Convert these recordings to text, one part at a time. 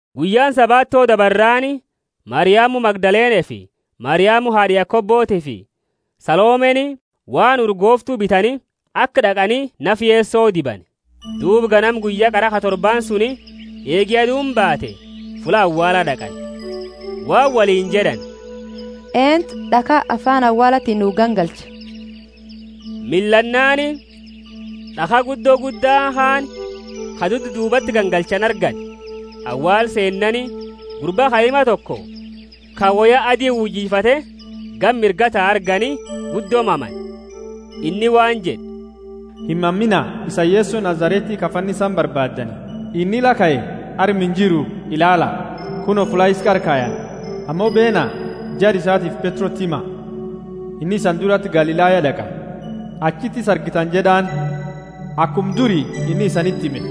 Guyyaani Sabato dabarraani, Mariamu Magdalenefi Mariamu haad'a Yakobotiifi Salomeni waan urgooftu bitani, aka d'aqani nafa Yeso dibani. Duuba ganama guyya qara ka torbaani suni, eegi aduuni baate, fulla awaala d'aqani. Waan woliini jed'ani, Eentu d'akha afaani awaalati nuu gangalcha? Millannaani, d'akha guddo gudda kaani ka dudduubati gangalchani argani. Awaala seenani, gurba kaima toko, ka woya adi uyifate gama mirgaa tau argani, guddo mamani. Inni waan jed'e, Himamiina; isani Yeso Nazareti ka fannisani barbaaddani. Inni la kae, arma injiru! Ilaala, kuno, fulla isa qara kayani. Ammo beena, jara isatiifi Petroti hima, Inni isani durati Galilaya d'aqa, achiti isa argitani jed'aani, akuma duri inni isaniti hime.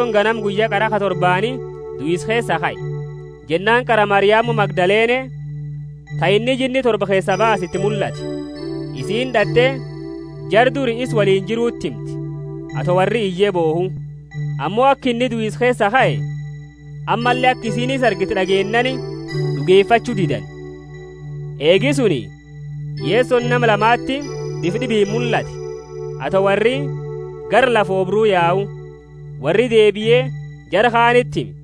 Yesoni ganama guyya qara ka torbaani duisa keesaa kae. Jennaani qara Mariamu Magdalene, ta inni jinni torba keesaa baase iti mullate. Isiini d'at'e jara duri isa woliini jiruti himte, ato worri iye bohu. Ammo aka inni duisa keesaa kae, ammalle aka isiini isa argite d'ageennaani, d'ugefachu didani. Eegi suni, Yesoni nama lamati bifa d'ibiini mullate, ato worri gara lafa oobru yau. Worri deebie, jara kaaniti hime,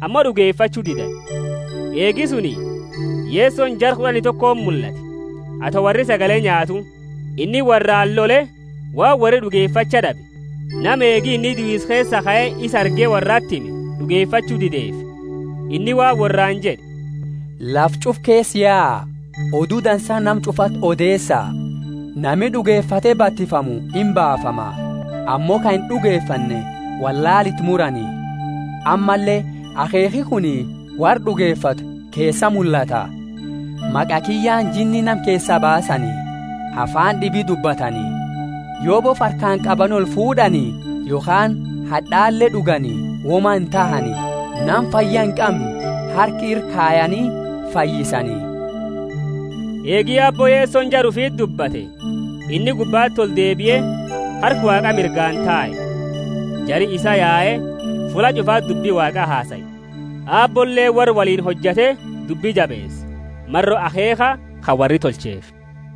ammo d'ugefachu didani. Eegi suni, Yesoni jara kud'ani tokoti mullate, ato worri sagale nyaatu. Inni worraani lole waan worri d'ugefacha d'abe, nama eegi inni duisa keesaa kae isa arge, worrati hime d'ugefachu dideefi. Inni waan worraani jed'e, Lafa ch'ufa keesa yaa, Odu Dansa nama ch'ufati odeesa. Nami d'ugefate batifamu imbaafama, ammo ka ind'ugefanne wollaala iti murani. Ammalle akheekhi kuni worra d'ugefatu keesa mullata: maqa kiyyaani jinni nama keesaa baasani; afaani d'ibiini dubbatani; yo bofa harkaani qabani olfuud'ani, yokhaani had'ale d'ugani woma intahani; nama fayya inqamne harka ira kayani fayyisani. Eegi Aabbo bo Yesoni jara ufiti dubbate, inni gubbati oldeebie, harka Waaqa mirgaani tae. Jari isaa yae, fulla ch'ufati dubbi Waaqa hasae; Aabboleeni worra woliini hojate dubbi jabeese, maro akheekha ka worri tolcheefi.]